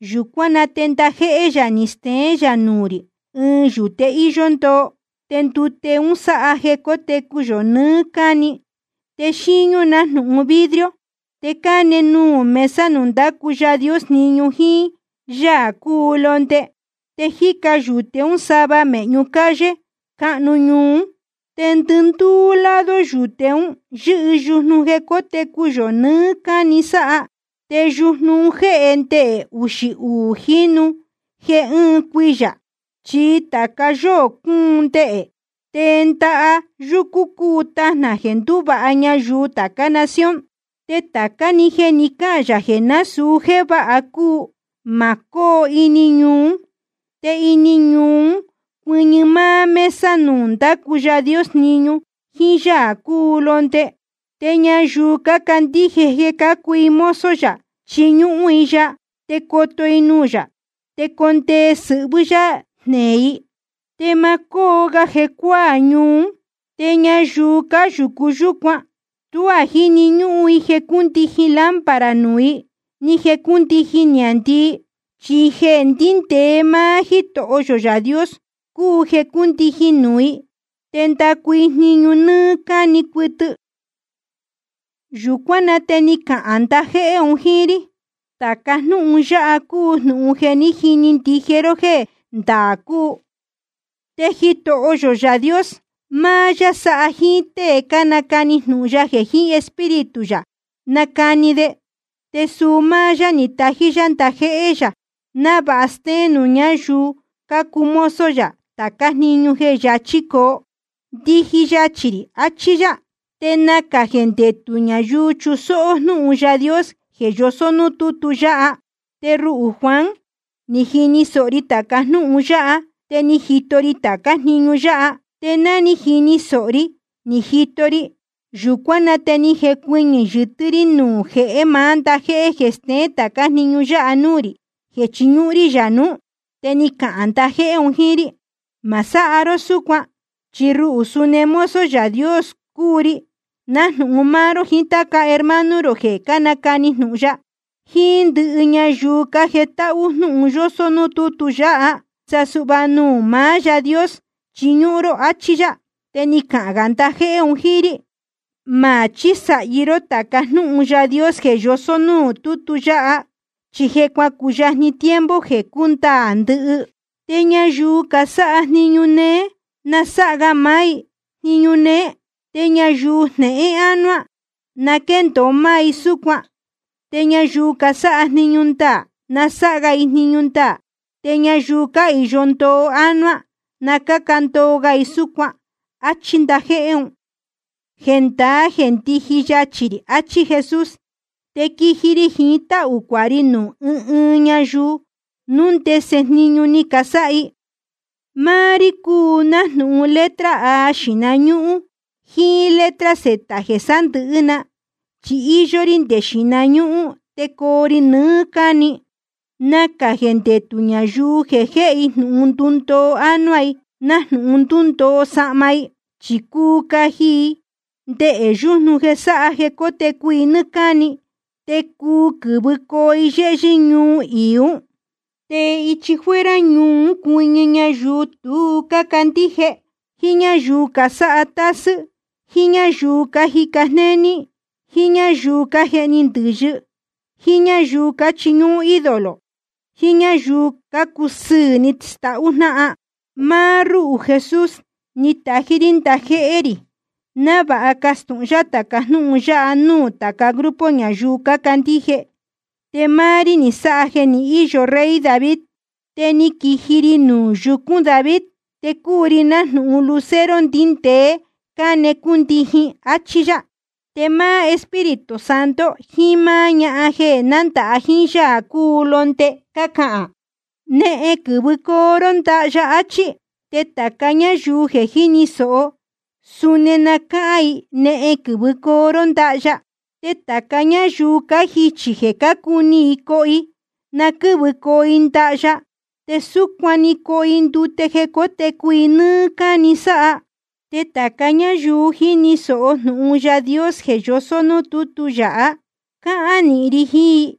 Yūcuán na te ndajéhé yā ni steén yā nuū rī ɨɨn yūte íyó ndoo. Te ndute un sáha jeē cótecu yō nɨɨ́ cáni. Te xíñú nájnūhun vidrio, te cáne nuū mesa nuū ndácu Yaā Dios jniñu jíín Yaā cúu Londe. Te jíca yūte ún sava mēhñu calle cáhnu ñuu ún. Te ndɨndúú lado yuyúte un yɨ́hɨ yujnu jeē cótecu yō nɨɨ́ cáni sáha. Te yujnu un jéhe ndehē uxī uū jínu jeē ɨɨn cuiyā, chi tāca yóō cúun ndehē. Te ndaha yúcú i cúu tajnā jeē ndúvāha ñayuu tācá nación. Te tācá‑ni jeē ni cáhān yā jeē násūu jéē váha cúu, ma cóo ini ñuu ún. Te ini ñuu ún cuɨñɨ máá mesa nuū ndácu Yaā Dios jniñu jíín Yaā cúu Londe. Te ñayuu cácandíje jeē cácuu i mozo yā, chiñúhún i ya. Te coto i nuū yā, te condee sɨhvɨ́ yá jneē i. Te ma cóo ga jecuáā ñuu ún. Te ñayuu cáyūcu yúcuan tuá jíni ñúhún i jeē cúndijin lámpara nuū i, ni jeē cúndijin niāndii. Chi jeē ndíndēe máá Jítoho yō Yaā Dios cúu jeē cúndijin nuū i. Te ndacu i jniñu nɨ́ɨ́ cáni cuɨtɨ. Yūcuán na te ni cahān ndajéhé un jíín rí: Tāca jnúhun yáha cúu jnūhun jeē jiní ndije ró jéē ndaā cúu. Te Jitoho yō Yaā Dios, máá yá sáha jíín tée cánacani jnūhun ya jeē jiín Espíritu yā cánacani de. Te suu máá yá ni tají yá ndajéhé yā návāha stéén nuū ñáyuu cácuu mozo yā tācá jniñu jeē yachī coo. Ndiji yachī rī, achí yá. Te nacā jeē ndetū ñayuu chusóhó jnúhun Yaā Dios jeē yosó núū tútu yáha. Te ruhū Juan, ni jini sōho ri tāca jnúhun yáha, te ni jito ri tācá jniñu yáha. Te ná ni jini sōho ri ni jito ri, yūcuán na te ni jecuɨñɨ̄ yɨtɨ́ rí nuū jehé maá ndajéhé jeē ni stéén tācá jniñu yáha núū rī, jeē chiñúhún rí yā nuú. Te ni cahān ndajéhé un jíín rí: Ma sáha ró súcuan. Chi ruhū suni mozo Yaā Dios cúu ri, nájnūhun máá ró jiín táca hermano rō jeē cánacani jnūhun ya, jiín ndɨhɨ ñayuu cájetáhú jnūhun yósó nuū tútu yáha. Sa suhva nuū maá Yaā Dios chiñúhún ró. Achí yá. Te ni cahān gā ndajéhé un jíín rí: Ma chísāhi ró táca jnúhun Yaā Dios jeē yosó núū tútu yáha, chi je cuacuyajni tiempo jeē cúndaā ndɨhɨ. Te ñayuu casáha jniñu néé, na sáha ga máá i jniñu néé. Te ñayuu jnehén ánuá, na quéndōo máá i súcuan. Te sa ñayuu casáha jniñu ndaā, na sáha ga i jniñu ndaā. Te ñayuu cáhīyo ndoo ánuá, na cáca ndoo ga i súcuan. Achí ndajéhé un. Jendaá jeē ndiji yachī rī, achí Jesús. Te quiji ri jiín táhū cuāha ri nuū ɨɨn ɨɨn ñayuu, núu ndese jniñu ni casáha i. Máá rí cúu nájnūhun letra A xīhna ñúhún jíín letra Z jeē sándɨ̄hɨ́ na, chi íyó rí nde xīhna ñúhún te coo ri nɨɨ́ cáni. Nacā jeē ndetū ñayuu jeē jéhe i jnūhun ndundoo ánuá i nájnūhun ndúndoo sahma. Chi cuu caji i ndehē yujnu jeē sáha jeē cótecu i nɨ́ɨ́ cáni, te cuu quɨ̄vɨcoo i yéhyɨ́ ñuu iī ún. Te ichi fuera ñuu ún cuɨñɨ ñayuu tu cácandíje, jíín ñáyuu casáha tásɨ́, jíín ñáyuu cájica jnéní, jíín ñáyuu cájehni ndɨ̄yɨ, jíín ñáyuu cáchiñúhún ídolo, jiín ñáyuu cácusɨɨ̄ ni stahú jnáhan. Máá rúhū Jesús, ni tají rí ndajéhé rī návāha castūhun yá tāca jnúhun yáha nuū tāca grupo ñayuu cácandíje. Te máá rí ni sáha jeē ni íyo rey David, te ni quiji ri nuū yucún David. Te cúu ri nájnūhun lucero ndíndēe cáne cúndijin. Achí yá. Te máá Espíritu Santo jiín máá ñahan jeē nándāha jíín Yaā cúu Londe, cácahān: Nehen, quɨ̄vɨcoo ró ndaha ya, achí. Te tāca ñáyuu jeē jíni sōho, suni na cáhán i: Nehen, quɨ̄vɨcoo ró ndaha ya. Te tāca ñáyuu cájichī jeē cácuni i coho i, na quɨ́vɨcoo i ndaha ya, te súcuan‑ni na cóho i ndute jeē cótecu i nɨ́ɨ́ cáni sáha. Te tāca ñáyuu jíni sōho jnūhun Yaā Dios jeē yosó núū tútu yáha, cáhán nīhin ri jiín i: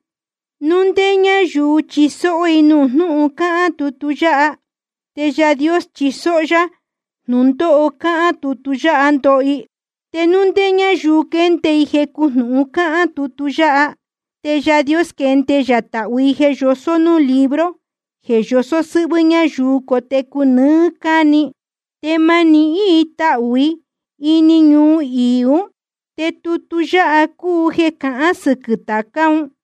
Núu ndé ñáyuu chisóó i nuū jnúhun cáhán tutu yáha, te Yaā Dios chisóó yá jnūndóho cáhán tutu yáha, ndoho i. Te núu ndé ñáyuu quende i jecu jnūhun cáhán tutu yáha, te Yaā Dios quende yā tahū i jeē yosó núū libro jeē yosó sɨ́hvɨ́ ñayuu cotecu nɨɨ́ cáni, te ma nihín i tahū i ini ñuu iī ún. Te tutu yáha cúu jeē cahán sɨquɨ̄ tācá un.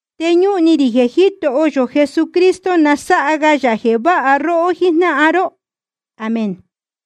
Te ñúhun ni rī jeē Jítoho yō Jesucristo na sáha ga yā jeē váha róhó jíjnáhan ró. Amén.